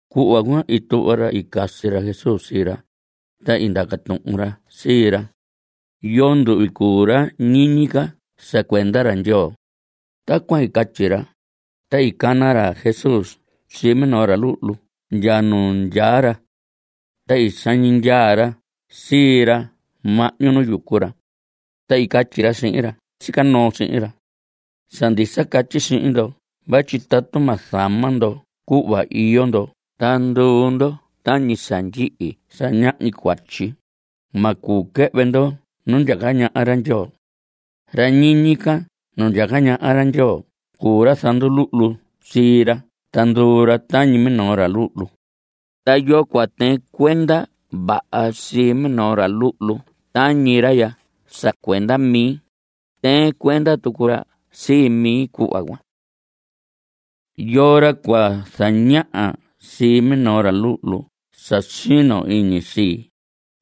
Cuhva cuan i tuhva ra i casi ra Jesús sii ra, ta i ndaca tuhun ra sii ra: ¿Yoo nduhvi cuu ra ñiñi ca sa cuenda ra Ndyoo? Tacuan i catyi ra, ta i cana ra Jesús sii minoo ra luhlu ndya nu ndyaa ra. Ta i sañi ndyaa ra sii ra mahñu nu yucu ra. Ta i catyi ra sihin ra sica noo sihin ra: Sa ndisa catyi sihin ndo vatyi tatu ma zama ndo cuhva iyo ndo ta nduu ndo tañi sa ndyihi sa ñahñi cuatyi, ma cuu quɨhvɨ ndo nu ndyaca ñaha ra Ndyoo. Ra ñiñi ca nu ndyaca ñaha ra Ndyoo cuu ra zanduluhlu sii ra ta nduu ra tañi minoo ra luhlu. Ta yoo cua tɨɨn cuenda vaha sii minoo ra luhlu tañi ra ya sa cuenda mi, tɨɨn cuenda tucu ra sii mi cuhva cuan. Yoo ra cua zañaha sii minoo ra luhlu sa sino iñi sii,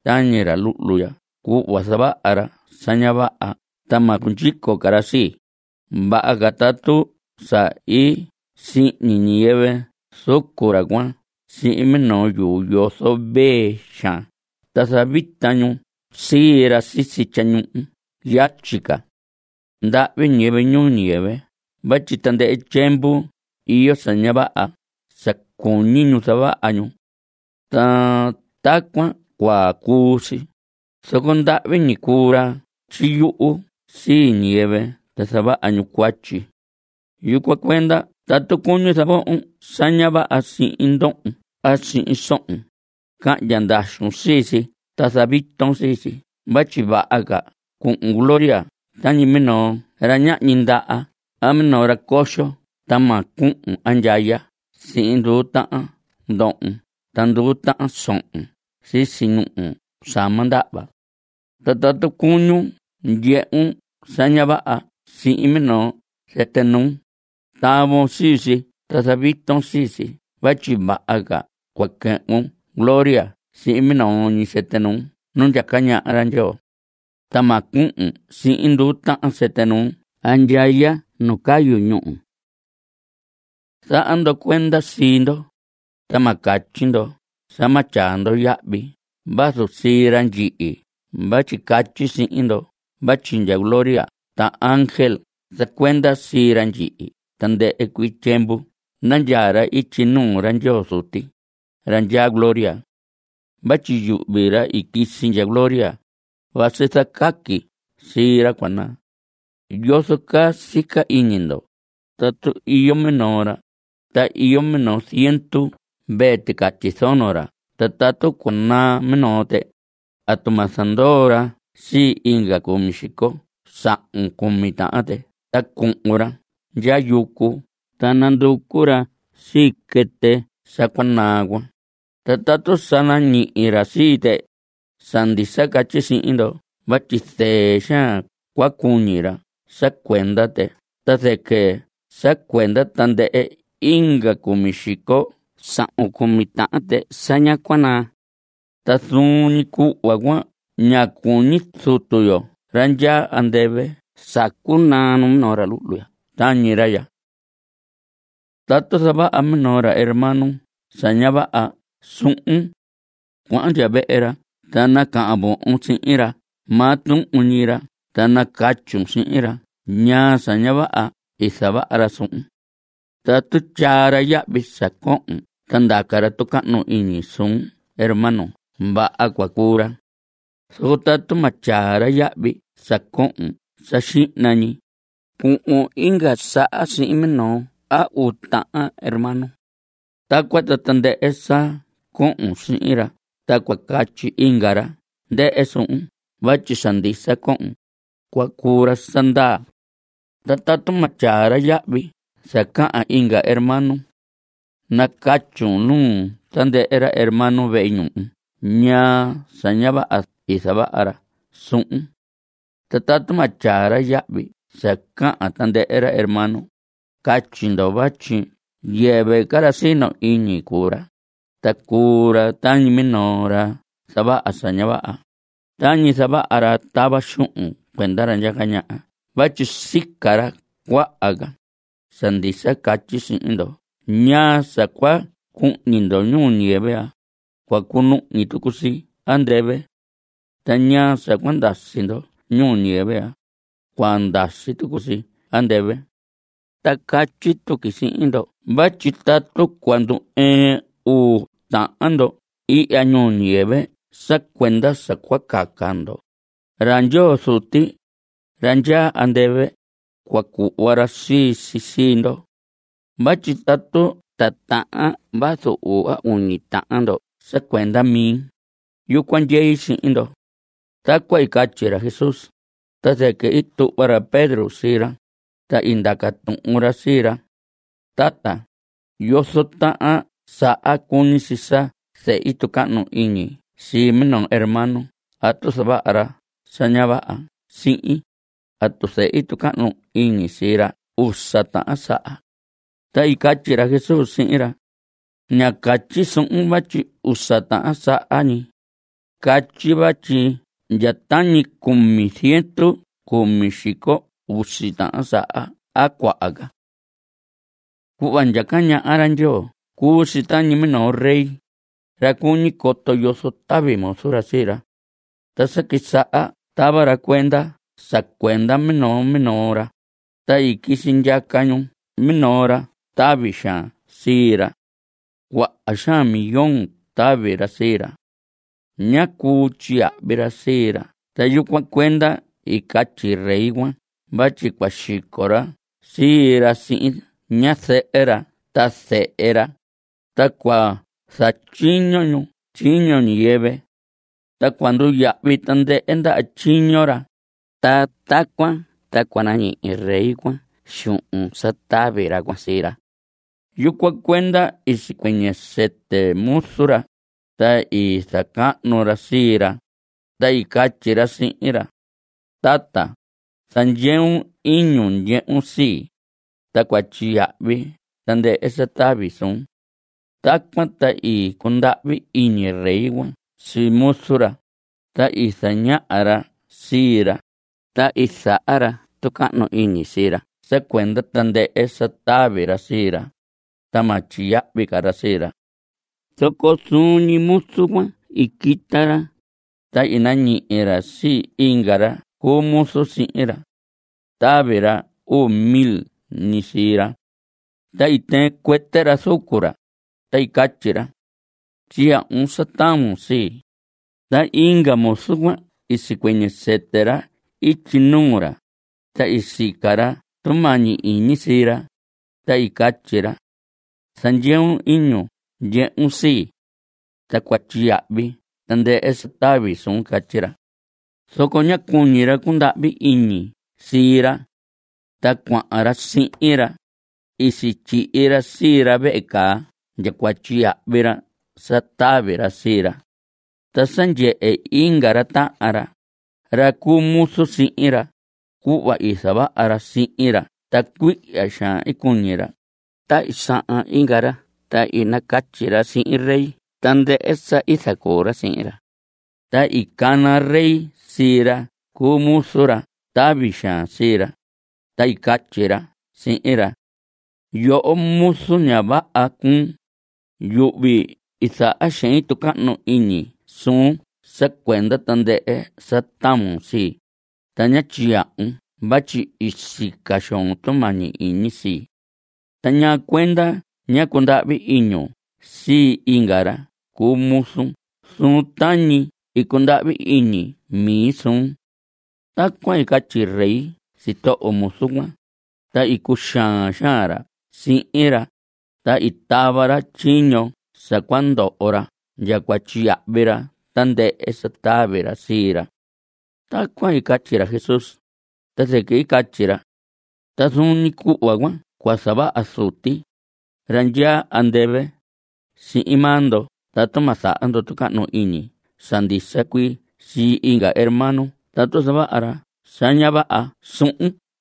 tañi ra luhlu ya cuhva zavaha ra sa ña vaha ta ma cundyico ca ra sii, vaha ca tatu sa i sihñi ñiyɨvɨ zucu ra cuan sihin minoo yuu yozo vee xaan ta zavita ñu sii ra sisi tyañuhu yatyi ca. ¡Ndahvi ñiyɨvɨ ñuu ñiyɨvɨ vatyi tandɨhɨ tyiemvu iyo sa ña vaha sa cuñi ñu zavaha ñu! Ta tacuan cua cuu si, zoco ndahvi ñi cuu ra tyiyuhu sii ñiyɨvɨ ta zavaha ñu cuatyi. Yucuan cuenda tatu cuñun zavohon sa ña vaha sihin ndohon a sihin sohon, cahndya ndaxun sii si ta zaviton sii si vatyi vaha ca cuhun gloria tañi minoo ra ñahñi ndaha a minoo ra coxo ta ma cuhun andyaya sihin nduu tahan ndohon ta nduu tahan sohon sisi ñuhu sa ma ndahva. Ta tatu cuñun ndyehun sa ña vaha sihin minoo sɨtɨ nuun, tavon sii si ta zaviton sii si vatyi vaha ca cua quɨhvun gloria sihin minoo ñi sɨtɨ nuun nu ndyaca ñaha ra Ndyoo, ta ma cuhun sihin nduu tahan sɨtɨ nuun andyaya nu cayu ñúhu. Zaha ndo cuenda sii ndo, ta ma catyi ndo sa ma tyaa ndo yahvi vazu sii ra ndyihi vatyi catyi sihin ndo vatyi ndya gloria ta ángel zacuenda sii ra ndyihi tandɨhɨ cuii tyiemvu nandyaa ra ityi nuu ra Ndyoo Zuti, ra ndyaa gloria. Vatyi yuhvi, ra i quisi ndya gloria, vasi zacaqui sii ra cua naa. ¿Yozo caa sica iñi ndo? Tatu iyo minoo ra, ta iyo minoo ziendu mvee ticatyi zono ra ta tatu cua naa minoo tɨ, ¿atu ma zandoo ra sii inga cumi xico sahun cumi tahan tɨ ta cuhun ra ndya yucu ta nanducu ra sii quɨtɨ sa cua naa cuan? Ta tatu sa nañihi ra sii tɨ, sa ndisa catyi sihin ndo vatyi zɨɨ xaan ca cua cuñi ra sa cuenda tɨ ta zɨquɨ sa cuenda tandɨhɨ inga cumi xico sahun cumi tahan tɨ sa ñá cua naa. Ta zuun ñi cuhva cuan ña cuñi Zutu yo ra ndyaa andɨvɨ sa cua naa numinoo ra luhlu tañi ra ya. Tatu zavaha minoo hermano sa ña vaha suhun. Cuahan ndya vehe ra ta nacahan vohon sihin ra maa tuhun ñi ra ta nacatyun sihin ra ñaa sa ña vaha i zavaha ra suhun. Tatu tyaa ra yahvi sa cohon ta ndaca ra tucahnu iñi suun hermano vaha cua cuu ra. Zoco tatu ma tyaa ra yahvi sa cohon sa xihna ñi, cuhun inga saha sihin minoo a uu tahan hermano. Tacuan ta tandɨhɨ sa cohon sihin ra ta cua catyi inga ra ndɨhɨ suhun vatyi sa ndisa cohon, cua cuu ra sa ndaa. Ta tatu ma tyaa ra yahvi sa cahan inga hermano. Nacatyun nuu tandɨhɨ ra hermano vehe ñuhu ñaa sa ña vaha i zavaha ra suhun. Ta tatu ma tyaa ra yahvi sa cahan tandɨhɨ hermano, catyi ndo vatyi yɨvɨ ca ra sino iñi cuu ra, ta cuu ra tañi minoo ra zavaha sa ña vaha, tañi zavaha ra tava xuhun cuenda ra ndyaca ñaha vatyi sica ra cuaha ca. Sa ndisa catyi sihin ndo ñaa sa cua cuhñi ndo ñuu ñiyɨvɨ ya, cua cunuhñi tucu si andɨvɨ. Ta ñaa sa cua ndasi ndo ñuu ñiyɨvɨ ya, cua ndasi tucu si andɨvɨ. Ta catyi tuqui sihin ndo vatyi tatu cua ndu‑ɨɨn uu tahan ndo ihya ñuu ñiyɨvɨ sa cuenda sa cua caca ndo, ra Ndyoo Zuti, ra ndyaa andɨvɨ, cua cuhva ra sii si sii ndo. Vatyi tatu titahan vazu uu a uñi tahan ndo sa cuenda mi, yucuan ndyei sihin ndo. Tacuan i catyi ra Jesús, ta zɨquɨ i tuhva ra Pedro sii ra, ta i ndaca tuhun ra sii ra: Tata, ¿yozo tahan saha cuñi si sa zehi tucahnu iñi sii minoo hermano tatu zavaha ra sa ña vaha sihin? ¿Atu zehi tucahnu iñi sii ra usa tahan saha? Ta i catyi ra Jesús sihin ra: Ña catyi suhun vatyi usa tahan saha ñi. Catyi vatyi ndya tañi cumi ziendu cumi xico usi tahan saha a cuaha ca. Cuhva ndyaca ñaha ra Ndyoo cuu si tañi minoo rey, ra cuñi coto yozo tavi muzu ra sii ra. Ta sa quisaha tava ra cuenda sa cuenda minoo minoo ra, ta i quisi ndyaca ñu minoo ra tavi xaan sii ra. Cuaha xaan millón tavi ra sii ra. Ñá cuu tyiyahvi ra sii ra ta yucuan cuenda i catyi rey cuan vatyi cua xico ra sii ra sihin ñazɨhɨ ra ta zehe ra, ta cua zatyiño ñu tyiño ñiyɨvɨ. Ta cua nduyahvi tandɨhɨ ndaha tyiño ra, ta tacuan ta cua nañihi rey cuan xuhun sa tavi ra cuan sii ra. Yucuan cuenda i sicuɨñɨ sɨtɨ muzu ra, ta i zacahnu ra sii ra, ta i catyi ra sihin ra: “Tata, zandyeun iñun ndyehun sii, ta cua tyiyahvi tandɨhɨ sa tavi suun.” Tacuan ta i cundahvi iñi rey cuan sii muzu ra, ta i zaña ra sii ra, ta i zaha ra tucahnu iñi sii ra sa cuenda tandɨhɨ sa tavi ra sii ra, ta ma tyiyahvi ra sii ra. Zoco zuun ñi muzu cuan i quita ra, ta i nañihi ra sii inga ra cu muzu sihin ra. Tavi ra uu mil ñi sii ra. Ta i tɨɨn cuɨtɨ ra zucu ra, ta i catyi ra: “¡Tyiyahvun sa tavon sii!” Ta inga muzu cuan i sicuɨñɨ sɨtɨ ra ityi nuu ra, ta i sica ra tumañi iñi sii ra, ta i catyi ra: “Zandyeun iñun ndyehun sii. Ta cua tyiyahvi tandɨhɨ sa tavi suun.” Catyi ra. Zoco ñá cuñi ra cundahvi iñi sii ra. Ta cuahan ra sihin ra, i sityihi ra sii ra vehe caa ndya cua tyiyahvi ra sa tavi ra sii ra. Ta sa ndyehe inga ra tahan ra, ra cu muzu sihin ra, cuhva i zavaha ra sihin ra ta cuihya xaan i cuñi ra, ta i sahan inga ra ta i nacatyi ra sihin rey tandɨhɨ sa i zacuu ra sii ra. Ta i cana rey sii ra cu muzu, ra tavi xaan sii ra, ta i catyi ra sihin ra: “¡Yoho, muzu ña vaha cuun! Yuhvi i zaha xein tucahnu iñi suun sa cuenda tandɨhɨ sa tavon sii, ta ñá tyiyahvun vatyi i sica xoon tumañi iñi sii. Ta ¿ñaa cuenda ñá cundahvi iñun sii inga ra cu muzu suhun tañi i cundahvi iñi mi suun?” Tacuan i catyi rey sitoho muzu cuan, ta i cuxaan xaan ra sihin ra, ta i tava ra tyiño sa cua ndoho ra ndya cua tyiyahvi ra tandɨhɨ sa tavi ra sii ra. Tacuan i catyi ra Jesús, ta zɨquɨ i catyi ra: Ta zuun ñi cuhva cuan cua zavaha Zuti, ra ndyaa andɨvɨ, sihin maa ndo tatu ma zaha ndo tucahnu iñi sa ndisa cuii sii inga hermano tatu zavaha ra sa ña vaha suhun.